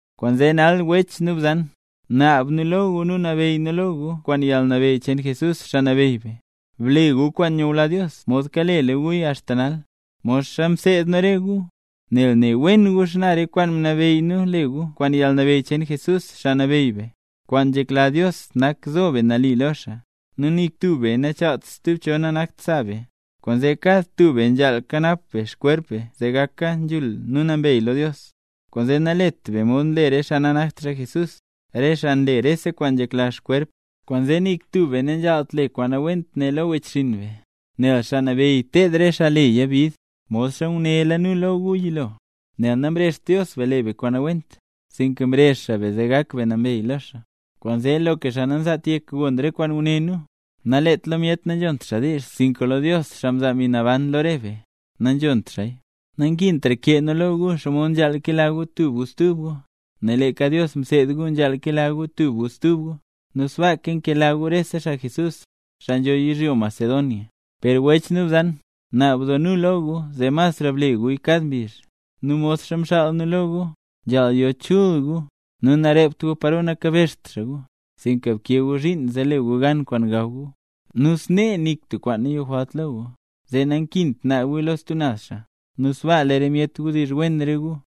Kwaanzee nal wech nu bzan, naab nu lo gu nu nabeyy nu lo gu kwaan yalnabeyy cheen Jesús, Xaa Nabeyy be: Ble gu kwaan nyula Dios mod kaleka guya axta nal, modxa mseed nu re gu. Nel ne wen gu xana re kwaan mnabeyy nu le gu kwaan yalnabeyy cheen Jesús, Xaa Nabeyy be. Kwaan nzhekla Dios nak zo be nali lo xaa, nu nik tub be nachaalt stub cho nanakt sa be. Kwaanzee kad tub be nzhaal kanap be xkwerp be zee gaka kwaan nzhul nu nambey lo Dios. Kwaanzee nalet be mod nle re xaa nanakt xaa Jesús, re xaa nle rese kwaan nzhekla xkwerp. Kwaanzee nik tub be nanzhaalt le kwaan nawent ne lo wechxinn be, nel Xaa Nabeyy ted re xaa leya bid, modxa ngunéla nuya lo gu yilo. Nel namrezht Dios be le be kwaan nawent, sinka mrezh xaa be zee gak be nambey lo xaa. Kwaanzee loka xaa nanzaat yek gon re kwaan nguné nu, nalet lo myet nanzhont xaa diizh, sinka lo Dios, xaa mzaa Mbi Naban lo re be, nanzhont xaaya. Nankintra kee nu lo gu xomod nzhaal kela gu tub gu stub gu, nel leeka Dios mseed gu nzhaal kela gu tub gu stub gu. Nu sbaaka nkela gu rese xaa Jesús, xaa nzho yizhyo Macedonia. Per wech nu bzan, naab doo nu lo gu zee masra ble guya kad mbizh. Nu modxa mxaal nu lo gu: Nzhaal yo chul gu, nu narept gu paro nakabezht xaa gu, sinka bkee gu zhiin zee le gu gan kwaan gaw gu, nu snee nik tub kwaan nayojwalt lo gu, zee nankint naab guya lo stub naz xaa, nu sbaa lee re myet wdizh wen re gu.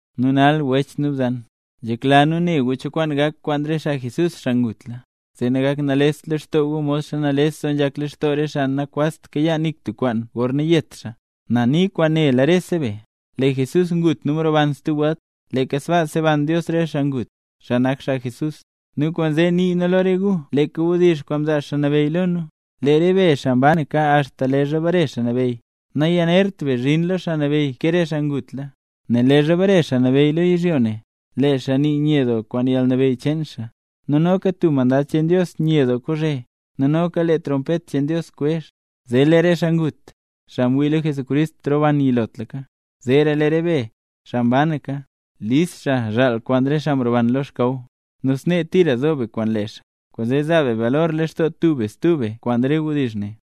Nu nal wech nu bzan, nzhekla nu ne gu cho kwaan gak kwaan re xaa Jesús, xaa ngutla, zee nagakt nalest lextoo gu modxa nales doo nzhak lextoo re xaa nakwazt kayaa nik tub kwaan gorna yet xaa. Na nii kwaan nela rese be: Lee Jesús ngut nu mroban stub welt, leeka sbaa seban Dios re xaa ngutla, xaa nak xaa Jesús. Nu kwaanzee nii nu lo re gu leeka wdizh kwaan mzaa Xaa Nabeyy lo nu; lee re be, xaa mbanaka axta leezha bare Xaa Nabeyy, nayanert be zhin lo Xaa Nabeyy ke re xaa ngutla. Nel leezha bare Xaa Nabeyy lo yizhyo ne, lee xaa nii nye doo kwaan yalnabeyy cheen xaa, nu noka tub mandad cheen Dios nye doo kozhe, nu noka lee trompet cheen Dios kwezh, zee lee re xaa ngut, xaa mwii lo Jesucrist, roban yilotlaka, zeera lee re be, xaa mbanaka, lis xaa zhaal kwaan re xaa mroban lo xkaw, nu snee tira zo re be kwaan lee xaa. Kwaanzee zaa be balor lextoo tub be stub be kwaan re wdizh ne.